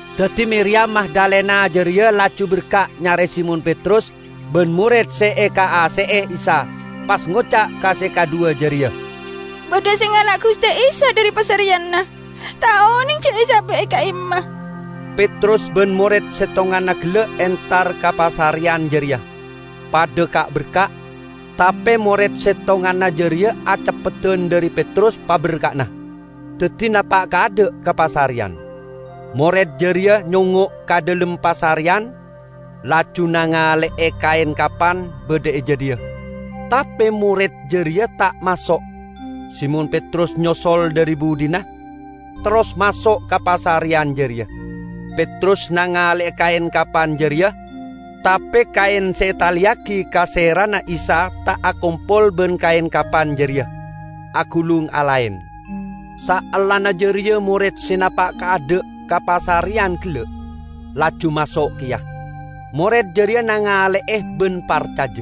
Daddi Miriyam Magdalena jareya laju berka' nyare Simon Petrus ban mored se ekaase'e Isa, pas ngoca' ka se kadhuwa jareya, "Badha se ngala' Guste Isa dhari pasareyanna, ta' oneng ja' esaba' e ka'imma." Petrus ban mored settonganna gella' entar ka pasareyan jareya, padha ka'-berka', tape mored settonganna jareya aceppeddan dhari Petrus paberka'na, daddi napa' kaadha' ka pasareyan. Mored jareya nyongngo' ka dhalem pasareyan, laju nangale'e kaen kapan badha e jadhiya, tape mored jareya ta' maso'. Simon Petrus nyosol dhari budhina, terros maso' ka pasareyan jareya. Petrus nangale'e kaen kapan jareya, tape kaen se etaleyagi ka serana Isa ta' akompol ban kaen kapan jareya, agulung alaen. Saellana jareya mored se napa' kaadha' ka pasareyan gella', laju maso' keya. Mored jareya nangale'e ban parcaja. (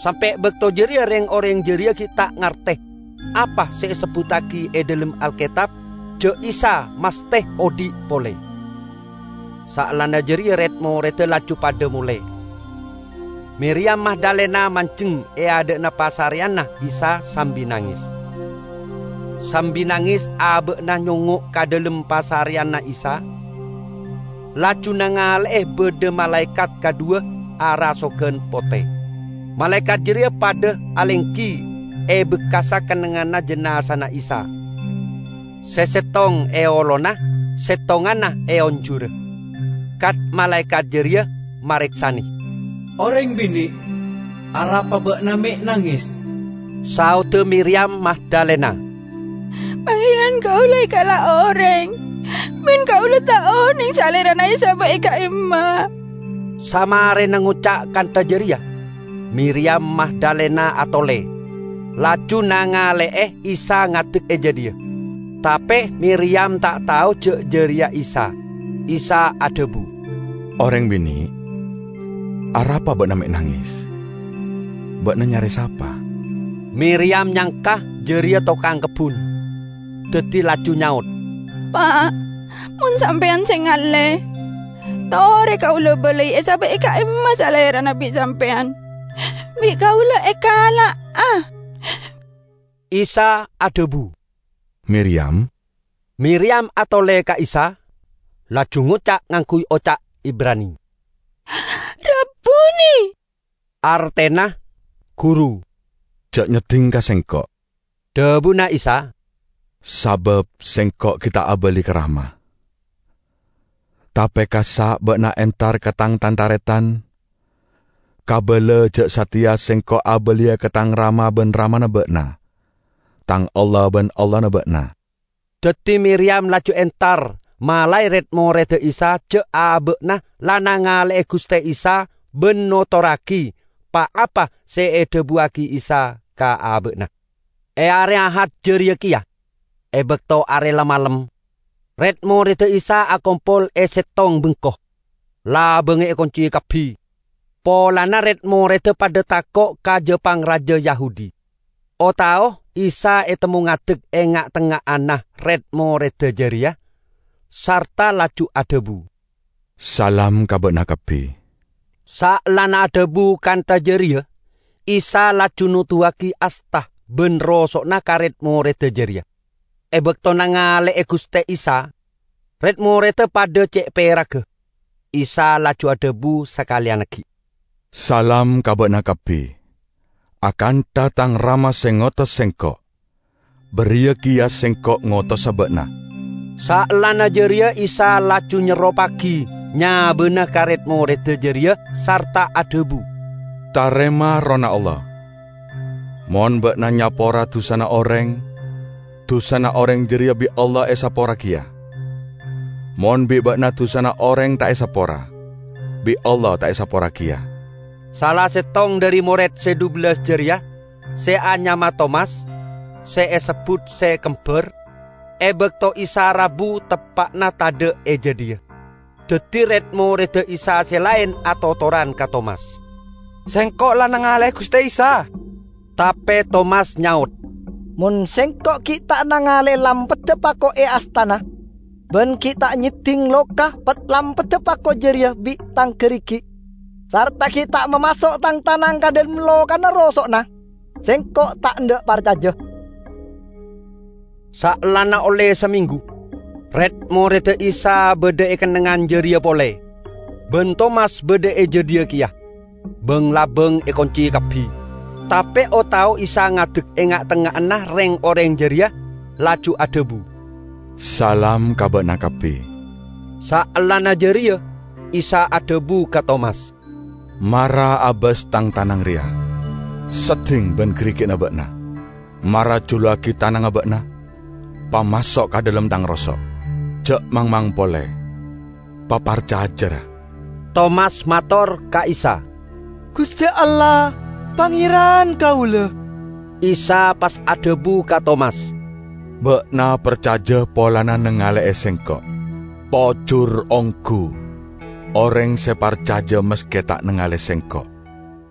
Sampe' bakto jareya reng-oreng jareya gi' ta' ngarte apa se esebbuttagi e dhalem Alketab ja' Isa masthe odhi' pole.) Saellana jareya red-moredda laju padha mole. Miriyam Magdalena manjeng e adha'na pasareyanna Isa sambi nanges. Sambi nanges aba'na nyongngo' ka dhalem pasareyanna Isa, laju nangale'e badha malaekat kadhuwa arasogan pote. Malaekat jareya padha alenggi e bekkassa kennengnganna jinazana Isa, se settong e olona, settonganna e onjurra. Kat-malaekat jareya mareksane, "Oreng bine', arapa ba'na me' nanges?" Saodda Miriyam Magdalena, "Pangeran kaula ekala' oreng, ban kaula ta' oneng Salerana esaba' e ka'imma." Samarena ngoca' kantha jareya, Miriyam Magdalena atole, laju nangale'e Isa ngadek e jadhiya. Tape Miriyam ta' tao ja' jareya Isa. Isa adhabu, "Oreng bine', arapa ba'na me' nanges? Ba'na nyare sapa?" Miriyam nyangka jareya tokang kebbun, daddi laju nyaot, "Pa', mon sampeyan se ngalle, tore kaula balai esaba' e ka'imma Salerana bi' sampeyan; bi' kaula ekala'a." Isa adhabu, "Miriyam!" Miriyam atole ka Isa, laju ngoca' ngangguy oca' Ibrani, "Rabuni!" (Artena "Guru".) "Ja' nyedding ka Sengko'!" dhabuna Isa, "sabab Sengko' gi' ta' abali ka Rama. Tape kassa' ba'na entar ka Tang tan-taretan, kabala ja' sateya Sengko' abaliya ka Tang Rama ban Ramana ba'na, Tang Allah ban Allahna ba'na." Daddi Miriyam laju entar malae red-moredda Isa ja' aba'na la nangale'e Guste Isa ban notorragi pa-apa se edhabuwagi Isa ka aba'na. E are Ahad jareya keya, e bakto are la malem, red-moredda Isa akompol e settong bengko; labangnga ekunci kabbi, polana red-moredda padha tako' ka ja-pangraja Yahudi. O-tao Isa etemmo ngadek e nga'-tengnga'anna red-moredda jareya, sarta laju adhabu, "Salam ka ba'na kabbi." Saellana adhabu kantha jareya Isa laju noduwagi asta ban roso'na ka red-moredda jareya. E bakto nangale'e Guste Isa, red-moredda padha ce' peragga. Isa laju adhabu sakaleyan aggi', "Salam ka ba'na kabbi. Akantha Tang Rama se ngotos Sengko', bariya keya Sengko' ngotosa ba'na." Saellana jareya Isa laju nyerroppagi nyabana ka red-moredda jareya sarta adhabu, "Tarema Errohna Allah. Mon ba'na nyapora dusana oreng, dusana oreng jareya bi' Allah esapora keya. Mon bi' ba'na dusana oreng ta' esapora, bi' Allah ta' esapora keya." Sala settong dhari mored se dhubellas jareya, se anyama Tomas, (se esebbut se "Kembar"), e bakto Isa rabu teppa'na tadha' e jadhiya. Daddi red-moredda Isa se laen atotoran ka Tomas, "Sengko' la nangale'e Guste Isa!" Tape Tomas nyaot, "Mon sengko' gi' ta' nangale'e lampadda pako e astana, ban gi' ta' nyedding loka pad-lampadda pako jareya bi' tang garigi' sarta gi' ta' mamaso' tang tanang ka dhalem lokana roso'na, sengko' ta' endha' parcaja." Saellana olle samenggu red-moredda Isa badha e kennengngan jareya pole, ban Tomas badha e jadhiya keya. Bang-labang ekunci kabbi. Tape o-tao Isa ngadek e nga'-tengnga'anna reng-oreng jareya, laju adhabu, "Salam ka ba'na kabbi." Saellana jareya Isa adhabu ka Tomas, "Mara abas Tang tanang reya, sedding ban garigi'na ba'na. Mara juluwagi tanangnga ba'na, pamaso' ka dhalem Tang roso'. Ja' mangmang pole, paparcaja, ra!" Tomas mator ka Isa, "Guste Allah Pangeran kaula!" Isa pas adhabu ka Tomas, "Ba'na parcaja polana nangale'e Sengko'. Pojur onggu oreng se parcaja maske ta' nangale Sengko'!"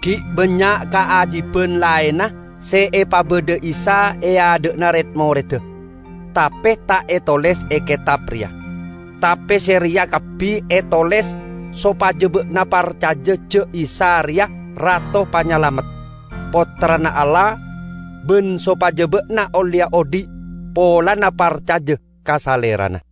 Gi' bannya' kaajiban laenna se epabadha Isa e adha'anna red-moredda, tape ta' etoles e ketab reya. Tape se reya kabbi etoles sopaja ba'na parcaja ja' Isa reya Rato Panyalamet, Pottrana Allah, ban sopaja ba'na olleya odhi' polana parcaja ka Salerana.